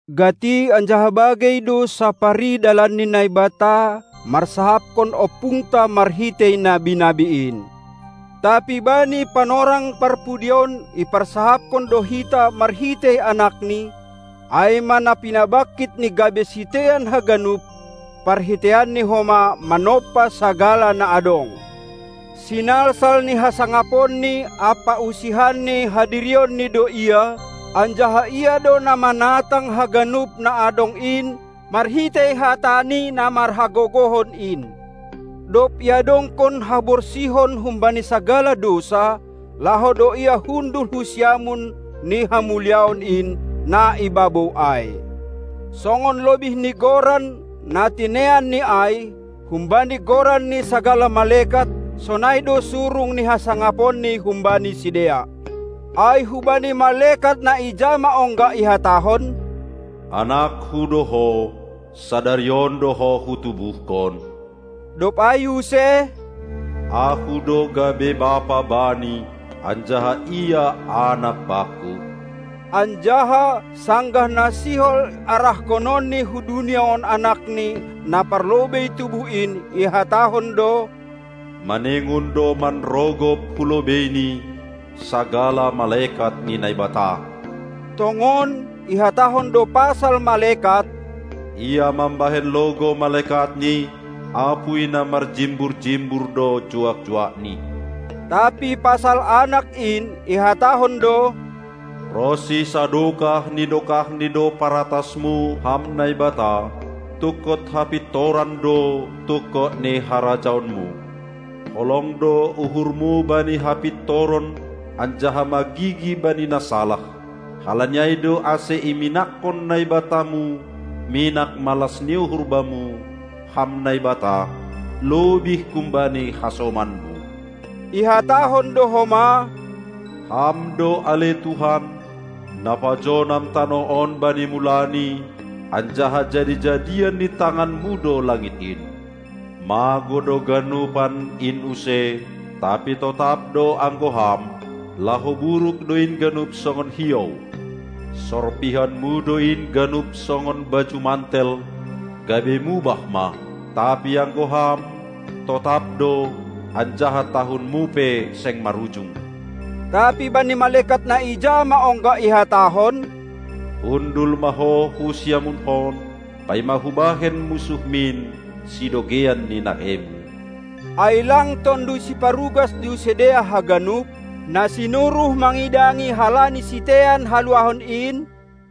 Gati anjaha bagei do sapari dalan ni Naibata marsahapkon ompungta marhitei nabi-nabi in; tapi bani panorang parpudi on iparsahapkon do hita marhitei AnakNi, ai ma na pinabangkitNi gabe sitean haganup, parhiteianNi homa manompa sagala na adong. Sinalsal ni hasangaponNi ampa usihan ni hadirionNi do Ia, anjaha Ia do na manatang haganup na adong in marhitei hataNi na marhagogohon in. Dob iadongkon haborsihon humbani sagala dousa, laho do Ia hundul hu siamun ni Hamuliaon in, na i babou ai. Songon lobih ni goran, na tineanNi ai, humbani goran ni sagala malekat, sonai do surung ni hasangaponNi humbani sidea. Ai hubani malekat na ija ma ongga ihatahon: "AnakKu do Ho, sadari on do Ho Hutubuhkon?" Dob ai use: "Ahu do gabe Bapa bani, anjaha Ia anak Bakku?" Anjaha, sanggah na sihol arahkononni hu dunia on AnakNi, na parlobei tubuh in, ihatahon do: "Maningon do manrogop hulobeiNi sagala malekat ni Naibata." Tongon, ihatahon do pasal malekat: Ia mambahen logou malekatni, apuy na marjimbur-jimbur do juak-juakni. Tapi pasal Anak in, ihatahon do: "Ronsi sadokah ni dokahni do paratasMu, Ham Naibata, tungkot hapintoran do tungkot ni harajaonMu. Holong do uhurMu bani hapintoron anjaha magigi bani na salah; halani ai do ase iminakkon NaibataMu minak malas ni uhur Bamu, Ham Naibata, lobih humbani hasomanMu." Ihatahon do homa: "Ham do, ale Tuhan, na pajonam tanoh on bani mulani, anjaha jadi-jadian ni tanganmu do langit in. Magou do ganupan in use, tapi totap do anggo Ham; laho buruk do in ganup songon hiou. Sorpihonmu do in ganup songon baju mantel, gabe mubah ma; tapi anggo Ham, totap do, anjaha tahunMu pe seng marujung". Tapi bani malekat na ija ma ongga ihatahon: "Hundul ma ho hu siamunHon, paima Hubahen munsuhMin sidogeian ni naheiMu?" Ai lang tonduy siparugas do sidea haganup, na sinuruh mangidangi halani sitean haluahon in?